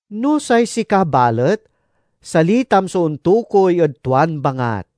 No say sika balet, salitam so ontokuy ed tuan bangat.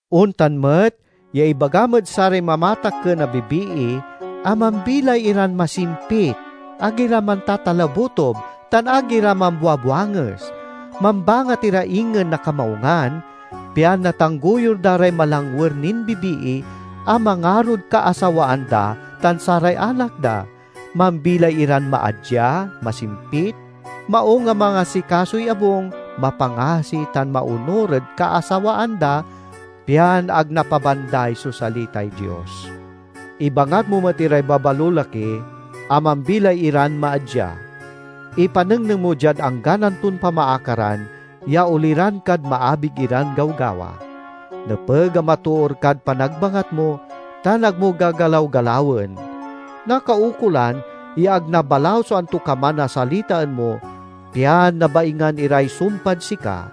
Ontan met ya ibagam ed saray mamatakken a bibii a mambilay iran masimpit, ag ira mantatalabutob, tan ag ira mambuabuanges; mambangat ira ingen na kamaungan, pian natanggoyur da ray malangwer nin bibii a mangarod kaasawaan da tan saray anak da, mambilay iran maadya, masimpit, maung a mangasikasoy abung, mapangasi tan maonur ed kaasawaan da, pian ag napabanday so salitay Dios. Ibangat mo met iray babalolaki a mambilay iran maadya. Ipanengneng mo diad anggan anton pamaakaran, ya oliran kad maabig iran gawgawa. Nepeg a matoor kad panagbangat mo, tan ag mo gagalaw-galawen. Nakaukolan ya ag nabalaw so antokaman a salitaen mo, pian nabaingan iray sumpad sika,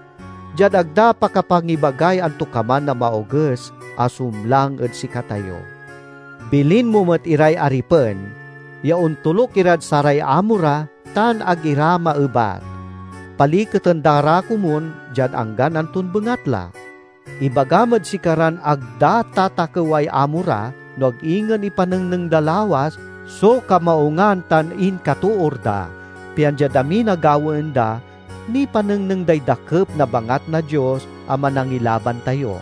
diad ag da pakapangibagay antokaman a maoges a sumlang ed sikatayo. Bilin mo met iray aripen ya ontoluk irad saray amo ra tan ag ira maebat. Paliketen da ra komun diad anggan anton bengatla. Ibagam ed sikaran ag da tatakeway amo ra no ag ingen ipanengneng da lawas so kamaungan tan inkatoor da, pian diad amin a gawaen da, nipanengneng day dakep na bangat na Dios a Manangilaban tayo.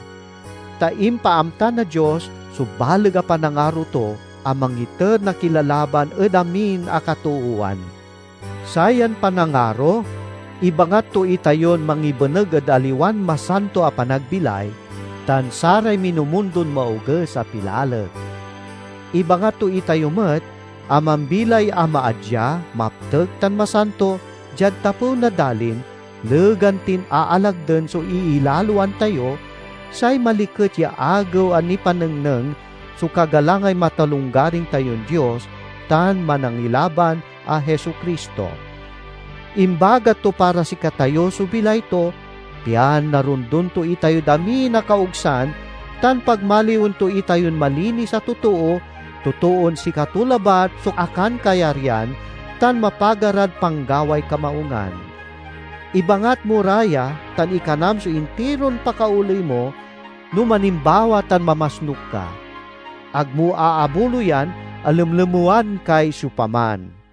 Ta impaamta na Dios so baleg a panangaro to a mangiter na kilalaban ed amin a katoowan. Sayan panangaro ibangat to itayon mangibeneg ed aliwan masanto a panagbilay, tan saray minumundon maoges a pilalek. Ibangat to itayo met a mambilay a maadya, maptek tan masanto diad tapew na dalin, legan tin aalagden so iilaloan tayo—say maliket ya Agew a nipanengneng so kagalangay matalonggaring tayon Dios tan Manangilaban a Jesu-Cristo. Imbagat to para sikatayo so bilay to, pian narondon to itayod amin a kaogsan tan pagmaliwen to itayon malinis a totoo, totoon sikato labat so akankayaryan tan mapaga rad panggaway kamaungan. Ibangat mo ra ya, tan ikanam so intiron pakaoley mo no manimbawa tan mamasnuk ka. Ag mo aabuloyan a lemlemewan kay siopaman.